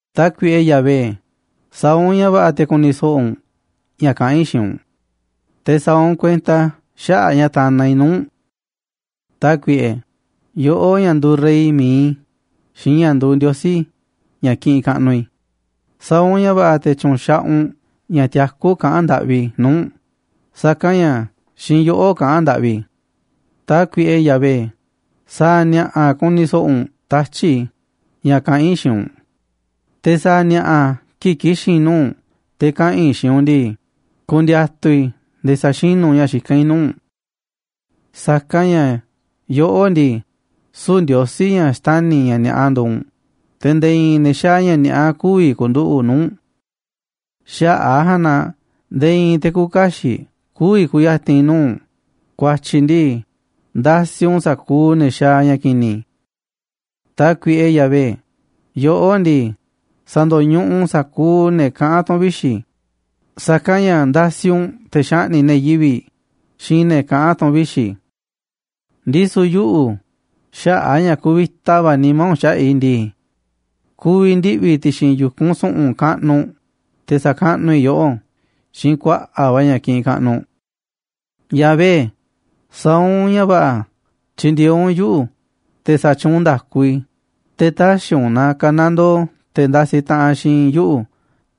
Tákuiꞌe, Yahvé, sa̱a̱ u̱nꞌ ña̱ va̱ꞌa̱ te̱ ku̱ni̱ so̱ꞌo̱ u̱nꞌ ña̱ kaꞌán i̱ xiinꞌ u̱nꞌ, te̱ sa̱a̱ u̱nꞌ kuenta xaꞌa̱ꞌ ña̱ tanaꞌ i̱ nuu̱ꞌ u̱nꞌ. Tákuiꞌe, yoꞌó ña̱ nduuꞌ rey mi̱iꞌ i̱ xiinꞌ ña̱ nduuꞌ Ndiosí, ña̱ kiꞌinꞌ kaꞌnuꞌ i̱, sa̱a̱ u̱nꞌ ña̱ va̱ꞌa̱ te̱ tyu̱nxaꞌaꞌ u̱nꞌ ña̱ tiakú kaꞌán ndaꞌvi i̱ nuu̱ꞌ u̱nꞌ, sa̱kanꞌ ña̱ xiinꞌ yoꞌó kaꞌán ndaꞌvi i̱. Tákuiꞌe, Yahvé, sa̱a̱ ni̱a̱ꞌa̱ ku̱ni̱ so̱ꞌo̱ u̱nꞌ tatyi̱ꞌ i̱ ña̱ kaꞌán i̱ xiinꞌ u̱nꞌ, te̱ sa̱a̱ ni̱a̱ꞌa̱ kii̱ꞌ ki̱xi̱n i̱ nuu̱ꞌ u̱nꞌ te̱ kaꞌa̱n i̱ xiinꞌ u̱nꞌ ndii, ku̱ndi̱a̱tu̱ i̱ nde̱e̱ sa̱xinú u̱nꞌ ña̱ xikán i̱ nuu̱ꞌ u̱nꞌ. Sa̱kanꞌ ña̱ yoꞌó ndii, süu̱ꞌ Ndiosí ña̱ xtani̱ ña̱ ni̱a̱ꞌa nduuꞌ u̱nꞌ, te̱ nde̱e̱ i̱i̱n ne̱ xaaꞌ ña̱ ni̱a̱ꞌa kü̱vi̱ ku̱nduꞌu̱ꞌ nuu̱ꞌ u̱nꞌ. Xaꞌa̱ꞌ a̱ ja̱a̱nꞌ na nde̱e̱ i̱i̱n te̱ küuꞌ kaxiꞌ kü̱vi̱ ku̱ya̱ti̱n nuu̱ꞌ u̱nꞌ, ku̱a̱tyi̱ ndii, ndasiꞌ u̱nꞌ sa̱kuuꞌ ne̱ xaaꞌ ña̱ ki̱ni̱. Tákuiꞌe Yahvé, yoꞌó ndii, sa̱ndo̱ñuꞌuꞌ u̱nꞌ sa̱kuuꞌ ne̱ kaꞌán tu̱n vixi̱, sa̱kanꞌ ña̱ ndasiꞌ u̱nꞌ te̱ xaꞌni̱ꞌ ne̱ yivi̱ꞌ xiinꞌ ne̱ kaꞌán tu̱n vixi̱. Ndisu̱ yuꞌu̱, xaꞌa̱ꞌ a̱ ña̱ kuvita va̱ nimá u̱nꞌ xaꞌa̱ꞌ i̱ ndii, ku̱vi̱ ndiꞌvi̱ i̱ ti̱xi̱n yu̱kunꞌ su̱ꞌu̱n kaꞌnuꞌ u̱nꞌ, te̱ sa̱kaꞌnuꞌ i̱ yoꞌó xiinꞌ kuaꞌa̱ꞌ va̱ ña̱ kiꞌinꞌ kaꞌnuꞌ. Yahvé, sa̱a̱ u̱nꞌ ña̱ va̱ꞌa̱ tyi̱ndi̱e̱eꞌ u̱nꞌ yuꞌu̱, te̱ sa̱tyuunꞌ nda̱ku i̱, te̱ tä̱xi̱ u̱nꞌ na ka̱nandoo te̱ ndasiꞌ taꞌanꞌ xiinꞌ yuꞌu̱,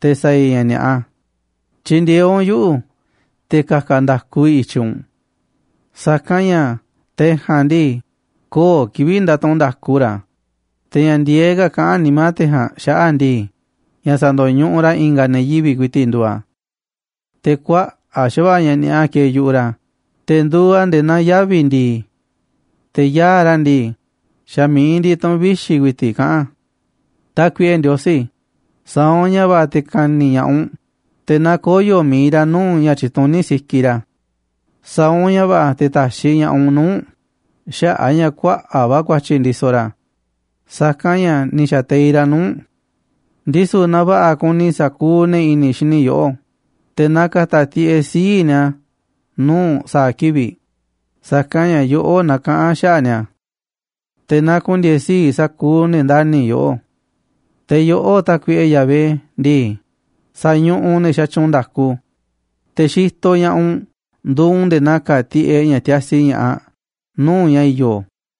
te̱ sa̱a̱ i̱ ña̱ ni̱a̱ꞌa. Tyi̱ndi̱e̱eꞌ u̱nꞌ yuꞌu̱ te̱ ka̱ka̱ nda̱ku i̱ i̱tyiꞌ u̱nꞌ. Sa̱kanꞌ ña̱ te̱ ja̱a̱nꞌ ndii, köo̱ꞌ kivi̱ꞌ ndatuꞌunꞌ nda̱ku ra̱, te̱ ña̱ ndi̱e̱eꞌ ka̱ kaꞌán nimá te̱ ja̱a̱nꞌ xaꞌa̱ꞌ ndii, ña̱ sa̱ndo̱ñuꞌuꞌ ra̱ i̱nga̱ ne̱ yivi̱ꞌ ku̱i̱ti̱ꞌ nduuꞌ a̱. Te̱ kuaꞌa̱ꞌ xa̱va̱ꞌa̱ ña̱ ni̱a̱ꞌa kieeꞌ yu̱ꞌuꞌ ra̱, te̱ nduuꞌ a̱ nde̱e̱ naa yavi̱ ndi̱i̱. Te̱ yaa̱ꞌ ra̱ ndii, xa̱ mi̱iꞌ ndiꞌiꞌ tu̱ꞌu̱n vixi̱ ku̱i̱ti̱ꞌ kaꞌán a̱. Tákuiꞌe Ndiosí, sa̱a̱ u̱nꞌ ña̱ va̱ꞌa̱ te̱ ka̱ni̱ ña̱ꞌaꞌ u̱nꞌ, te̱ na koyo̱ mi̱iꞌ ra̱ nuu̱ꞌ ña̱ tyituní sikiꞌ ra̱, sa̱a̱ u̱nꞌ ña̱ va̱ꞌa̱ te̱ ta̱xiꞌ ña̱ꞌaꞌ u̱nꞌ nuu̱ꞌ u̱nꞌ xaꞌa̱ꞌ a̱ ña̱ kuaꞌa̱ꞌ va̱ ku̱a̱tyi̱ ndisoꞌ ra̱, Sa̱kanꞌ ña̱ ni̱ xa̱teiꞌ ra̱ nuu̱ꞌ u̱nꞌ. Ndisu̱ na va̱ꞌa̱ ku̱ni̱ sa̱kuuꞌ ne̱ i̱ni̱ xini yoꞌó, te̱ na ka̱ta̱ tiꞌeꞌ sii̱ꞌ ni̱a̱ nuu̱ꞌ u̱nꞌ sa̱a̱ kivi̱ꞌ, sa̱kanꞌ ña̱ yoꞌó nakaꞌán xaꞌa̱ꞌ ni̱a̱. Te̱ na ku̱ndi̱e̱e̱ sii̱ꞌ sa̱kuuꞌ ne̱ ndani̱ yoꞌó. Te̱ yoꞌó, Tákuiꞌe Yahvé ndii, sa̱ñuꞌuꞌ u̱nꞌ ne̱ xatyuunꞌ nda̱ku, te̱ xitoꞌ ña̱ꞌaꞌ u̱nꞌ nduuꞌ u̱nꞌ nde̱e̱ na ka̱a̱ tiꞌeꞌ ña̱ tiasi ña̱ꞌaꞌ nuu̱ꞌ ña̱ i̱yo̱.